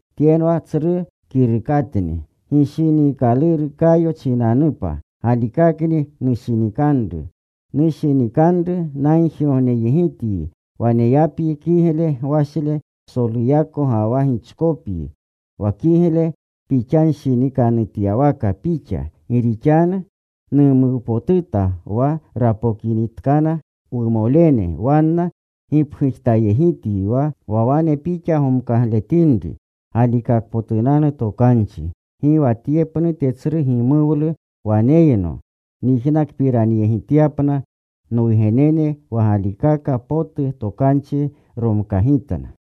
Tyenwa tsru kirukatni. Gishiniikaluru Kayo chinanupa, galikakni nushinikanru. Nushinikanru, nagjigogneyegityi waneyapyi kigle gwashle psoluyako ga wa gichkopyi, wa kigle pixanshinikanutyawaka pixka. Gi rixanu numuwpotuta wa rapokinitkana wumolene, wanna gipgujtayegityi wa wanepotuko pixinri, wa wane pixa gomkagitinri galikakpotunanu tokanchi. Gi wa tye pnute tsru gimuwlu waneyno, nyijnakpiranyegityapna nwugenene wa galikaka potu tokanchi romkagitna.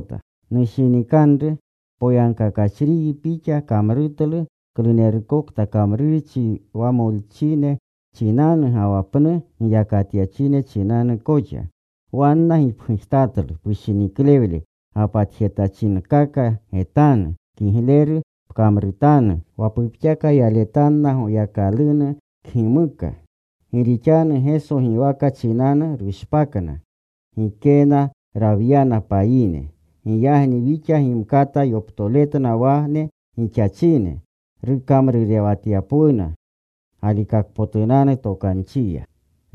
Nushinikanru, poyagkakachriyi pixa kamrutlu klunerukokta kamrurchi wa molchine chinanu ga wa pnu giyakatyachine chinanu koxa. Wanna gipgujtatlu pushiniklewle gapatjetachinkaka getanu. Kigleru pkamrutanu wa pupxaka yaletanna Goyakalunu kgimuka. Gi rixanu Geso giwaka chinanu rushpakna. Gikena rawyana payine. Giyagni wixa gimkata yoptoretna wane gixachine, rukamrurewatanunepwuna galikakpotunanu tokanchiya.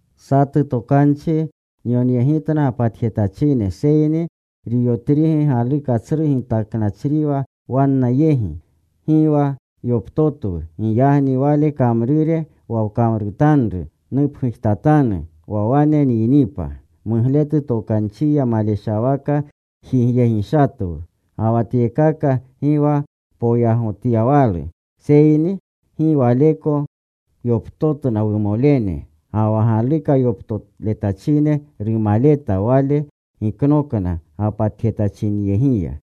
Satu tokanchi nyonyegitna gapatjetachine, seyni Riyotrigi galuka tsru gitakletnachriwa wanna yegi; gi wa yoptotwu. Giyagni wale kamrure wa kamrutanru nupgujtatanu wa wane nyinipa. Mugletu tokanchiya maleshawaka jigyegishatwu. Ga wa tyekaka gi wa poyagotyawalu, seyni gi waleko yoptotna wumolene ga wa galukayoptoletachine rumaleta. Wale giknokna gapatjetachinyegiya.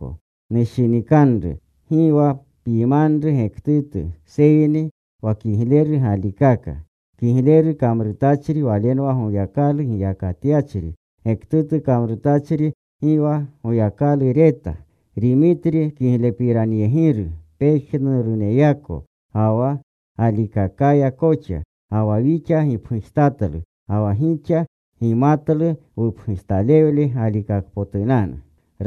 Nushinikanru, gi wa pyimanru gektutu seyni wa kigleru galikaka. Kigleru kamrutachri walenwa Goyakalu giyakatyachri. Gektutu kamrutachri, gi wa Goyakalu reta. Rimitri kiglepiranyegiru pejnuruneyako, ga wa galikakaya koxa. Ga wa wixa gipgujtatlu. Ga wa gixa gimatlu wupgujtalewle galikakpotunanu.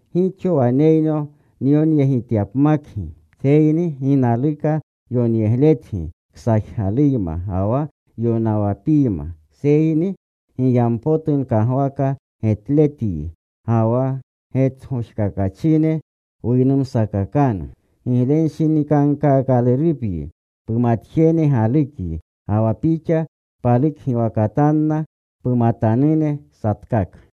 Gixo waneyno nyonyegityapmakyi, seyni gi naluka yonyegletyi ksajgaluyma ga wa yonawapiyma. Seyni giyampotu nkagwaka getletyi. Ga wa getgojkakachine wuynumsakakanu. Giglewanshinikankaakalurupyi. Pumatjene galukyi. Ga wa pixa palukgiwakatanna pumatanune satkaka.